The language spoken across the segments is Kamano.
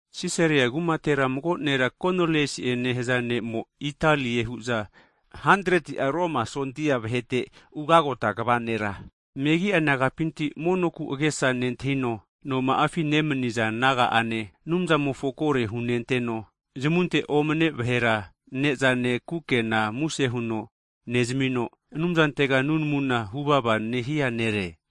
Sisaria kumatera mago nera Koniliasi'e nehaza ne'mo, Italie hu'za nehaza 100'a Romu Sondia vahete ugagota kva nera, megi'a nagapinti monoku agesa nentahino, noma'afi nemaniza naga'ane, Anumzamofo kore hunenteno, zamunte omane vahera ne'zane, kukenanena muse huno nezamino, Anumzantega nunamuna huvava nehia nere.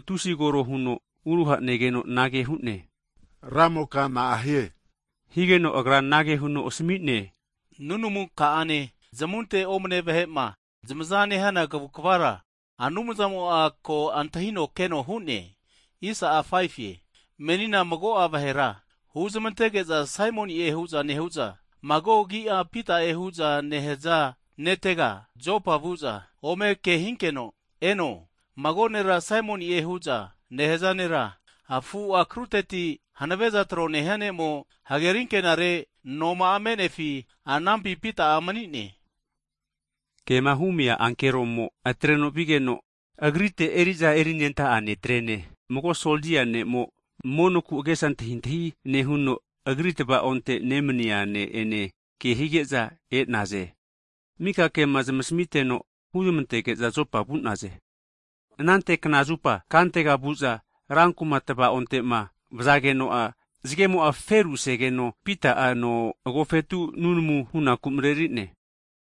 tusi kore huno uruha negeno anage hu'ne, Ramoka, na'ahie. Higeno agra anage huno asami'ne, Nunamu ka'ane, zamunte omane vahe'ma zamaza nehana kavukvara Anumzamo'a ko antahino keno hu'ne. Menina mago'a vahera huzamantege'za Saimoni'e nehu'za, mago agi'a Pita'e hu'za nehaza netega Jopa vu'za ome kehinkeno eno. Mago nera Saimoni'e hu'za nehaza nera, afutamimofo akruteti hanave'za tro nehia ne'mo, hageri ankenare noma'a me'nefi anampi Pita'a mani'ne. Kema humia ankeroma atreno vigeno, agrite eri'za erinenta'a netre'ne, mago sondia ne'mo monoku agesa antahintahi nehuno agri tavaonte nemani'a ne' ene kehige'za e'naze. Mika kema zamasmiteno huzmantege'za, Jopa vu'naze. Anante kna zupa kantega vu'za ranku'ma tavaonte'ma vazageno'a zagemo'ma feru asegeno, Pita'a no agofetu nunamu hunaku mareri'ne.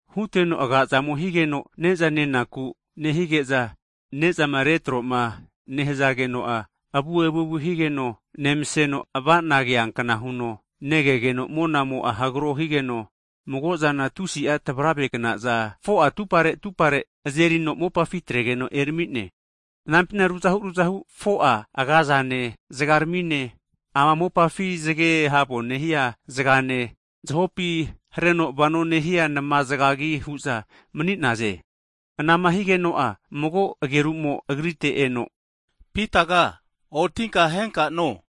Huteno aga'zamo higeno ne'za nenaku nehige'za ne'zama retroma nehazageno'a, avu evuevu higeno nemaseno ava'na keankna huno, kegeno monamo'a hagaro higeno, mago'zana tusi'a tavaravegnaza 4'a atupare atupare azerino atrageno mopafi erami'ne. Anampina ruzahu ruzahu 4'a agazane zagarmi'ne, ama mopafi zage havu nehia zagane, zahopi hareno vono nehia nama zagagi hu'za mani'naze. Anama higeno'a mago ageru'mo agrite eno Pitaga, otinka ahenka no!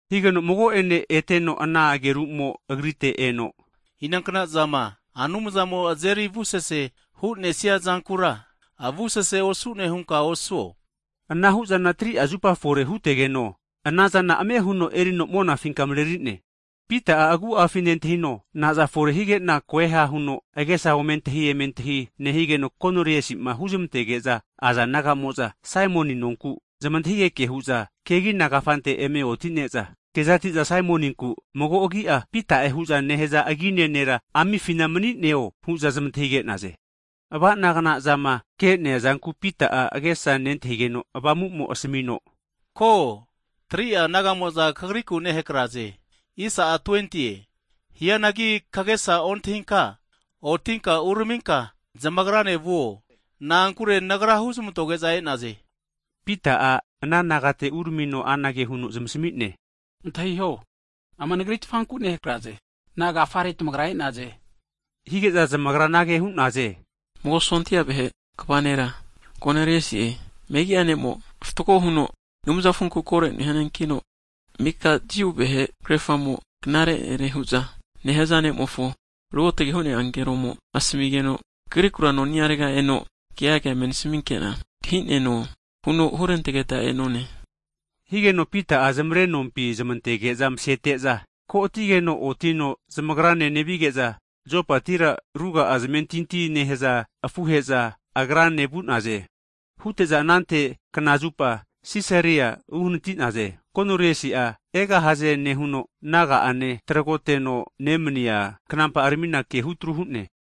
Higeno mago'ene eteno ana ageru'mo huno, Inankna'zama Anumzamo'ma azeri avusese hu'nesia zankura, avusese osu'ne hunka osuo. Anahu'zana 3'a zupa fore hutegeno, anazana ame huno erino monafinka mareri'ne. Pita'a agu'afi nentahino, nazafore hige'na koeha huno agesa omeantahi emeantahi nehigeno, Koniliasi'ma huzmantege'za aza naga'mo'za Saimoni nonku zamantahigeke hu'za, kegina kafante eme oti'ne'za, kezati'za Saimoninku mago agi'a Pita'ema hu'za nehaza agine nera amifina mani'neo hu'za zamantahige'naze. Ava'na kna'zama ke'nea zanku Pita'a agesa nentahigeno, Avamu'mo'a asamino, Ko, 3'a naga'mo'za kagriku nehakaze. Hianagi kagesa ontahinka otinka uraminka zamagrane vuo, na'ankure Nagra hu'zmantoge'za e'naze. Pita'a ana nagate uramino anage huno zamasmi'ne, Antahiho, ama nagritfanku nehakraze, nagafare tamagra e'naze? Hige'za zamagra anage hu'naze, Mago sondia vahe kva nera Koniliasi'e megi'a ne'kino fatgo avu'ava nehuno, Anumzamofonku kore nehia nekino, mika Jiu vahe krerafamo'za knare nere hu'za nehaza ne'mofo Ruotge hu'nea ankeromo asamigeno, kagriku noniarega eno keaga eme nasminkena antahineno huno hurantegeta e'none. Higeno Pita'a zamarenompi zamantege'za masete'za, ko ati'geno otino zamagrane nevige'za Jopatira ruga'a zamentinti nehaza afuhe'za agrane vu'naze. Hute'za anante knazupa, Sisaria vu'naze. Koniliasi'a egahaze nehuno, naga'ane tragoteno nemania knampa'aramina kehutru hu'ne.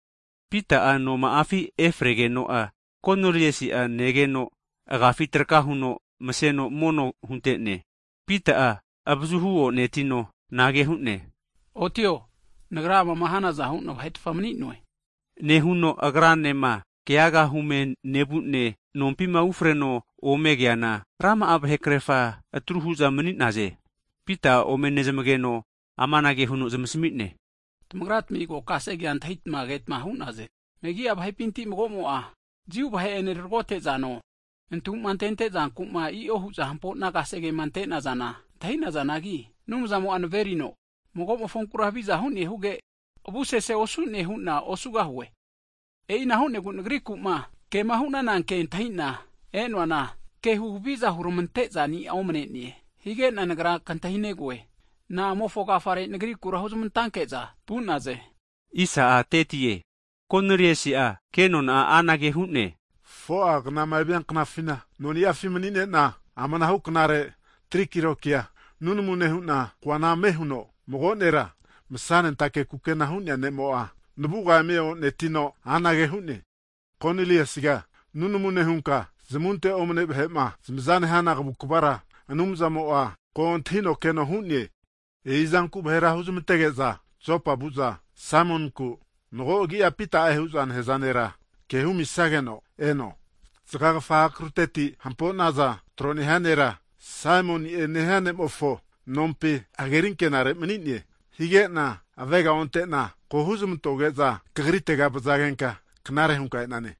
Pita'a noma'afi e'fregeno'a, Koniliasi'a negeno, agafi rena omereno mono hunte'ne. Pita'a avazuhu o'netino anage hu'ne, Otio! Nagra amama hanaza hu'na vahetfa mani'noe. Nehuno agranema keaga hume nevu'ne, nompima ufreno omegeana rama'a vahe krerafa atru hu'za mani'naze. Pita'a omenezmageno amanage huno zamasmi'ne, Tamagratmi ko kasegea antahitama ketma hu'naze, megi'a vahepinti mago'mo'a Jiu vahe'ene tragotezano, nantu'ma antente zanku'ma i'o hu'za hampo'na kasegema ante'nazana antahi'nazanagi, Anumzamo'a naverino, mago'mofonkura haviza hu'ne huge, avusese osu'ne hunka osuo huno hu'ne. E'ina hu'negu nagriku'ma kema hu'nana ke antahina e'noana, ke huhaviza hurmantezani'a omane'ne, higena nagra kantahinegoe, na'amofo agafare nagrikura huzmantanke'za vu'naze? Huno antahigegeno, Koneliasi'a kenona'a anage hu'ne, 4'a knama evia knafina noni'afi mani'nena, amanahu knare tri kilokia nunamu nehu'na, koana ame huno mago nera masa'nentake kukena hu'nea ne'mo navuga eme o'netino, anage hu'ne, Koniliasiga nunamu nehunka, zamunte omane vahe'ma zamaza nehana kavukvara Anumzamo'a ko antahino keno hu'ne. E'izanku vahera huzmantege'za Jopa vu'za Saimoninku, mago'agi'a Pita'e hu'za nehaza nera ke humisageno eno. Zgagafa akruteti hampo'naza tro nehia nera, Saimoni'e nehia ne'mofo nompi hageri ankenare mani'ne. Hige'na avega onte'na ko huzmantoge'za kagritega vazagenka knare'za hunka e'nane.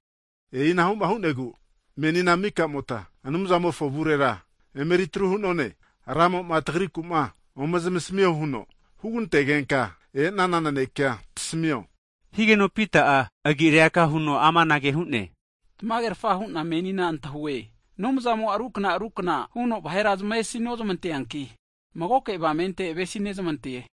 E'inahu'ma hu'negu menina, mika'mota Anumzamofo avurera emeritru hu'none. Ramo'ma tagriku'ma ome zamasmio huno hugantegenka e'nana nanekea tasmio. Higeno Pita'a amanage hu'ne, Tamagerafa hu'na menina antahue, Anumzamo'a rukna rukna huno vahera zamesi nozmanteanki, magoke avamente avesinezmante.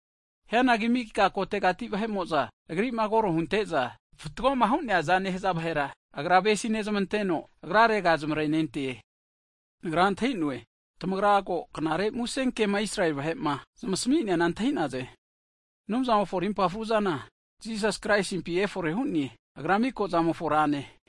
Hianagi mika kotegati vahe'mo'za (nation) Agri'ma koro hunte'za, fatgoma hu'neazama nehaza vahera, Agra avesi nezmanteno, Agrarega zamarenente. Nagra antah'inoe, tamagra ko Knare Musenkema Israeli vahe'ma zamasmi'neana antahi'naze. Anumzamofo rimpa fruzana Jisasi Kraisimpi efore hu'ne, Agra mika zamofo Rane.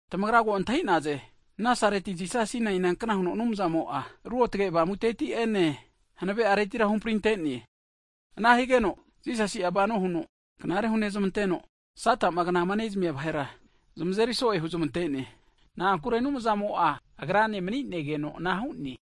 Tamagra ko antahi'naze Nazareti Jisasina inankna huno Anumzamo'a Ruotge Avamuteti'ene hanave areti'ene huhamprinte'ne. Ana higeno Jisasi'a vano huno knare hunezmanteno, Sata'ma knama nezmia vahera zamazeri so'e huzmante'ne, na'ankure Anumzamo'a Agrane mani'negeno ana hu'ne.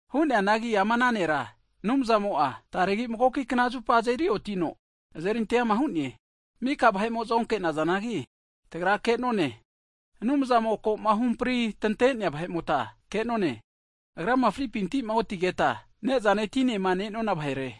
Hu'neanagi ama ana Nera, Anumzamo'a taregi magoki knazupa azeri otino, azeri anteama hu'ne. Mika vahe'mo'za onke'nazanagi, tagra ke'none, Anumzamo'ma ko'ma huhampri tante'nea vahe'mota ke'none, Agrama fripinti'ma otigeta, agranema ne'zane tinema ne'nona vahere.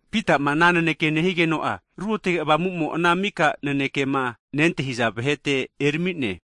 Pita'ma ana naneke nehigeno'a, Ruotge Avamu'mo ana mika nanekema nentahiza vahete eramine.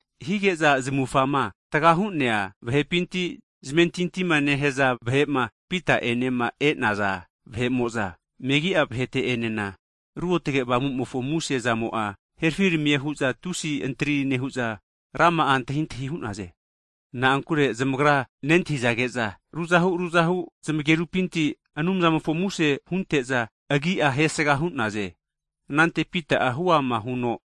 Hige'za zamufama tagahu'nea vahepinti zamentintima nehaza vahe'ma Pita'enema e'naza vahe'mo'za, megi'a vahete'enena Ruotge Avamu'mofo muse zamo'a herafiramie hu'za tusi antari nehu'za rama'a antahintahi hu'naze. Na'ankure zamagra nentahizage'za, ruzahu ruzahu zamagerupinti Anumzamofo muse hunte'za Agi'a hesga hu'naze. Anante Pita'a huama huno,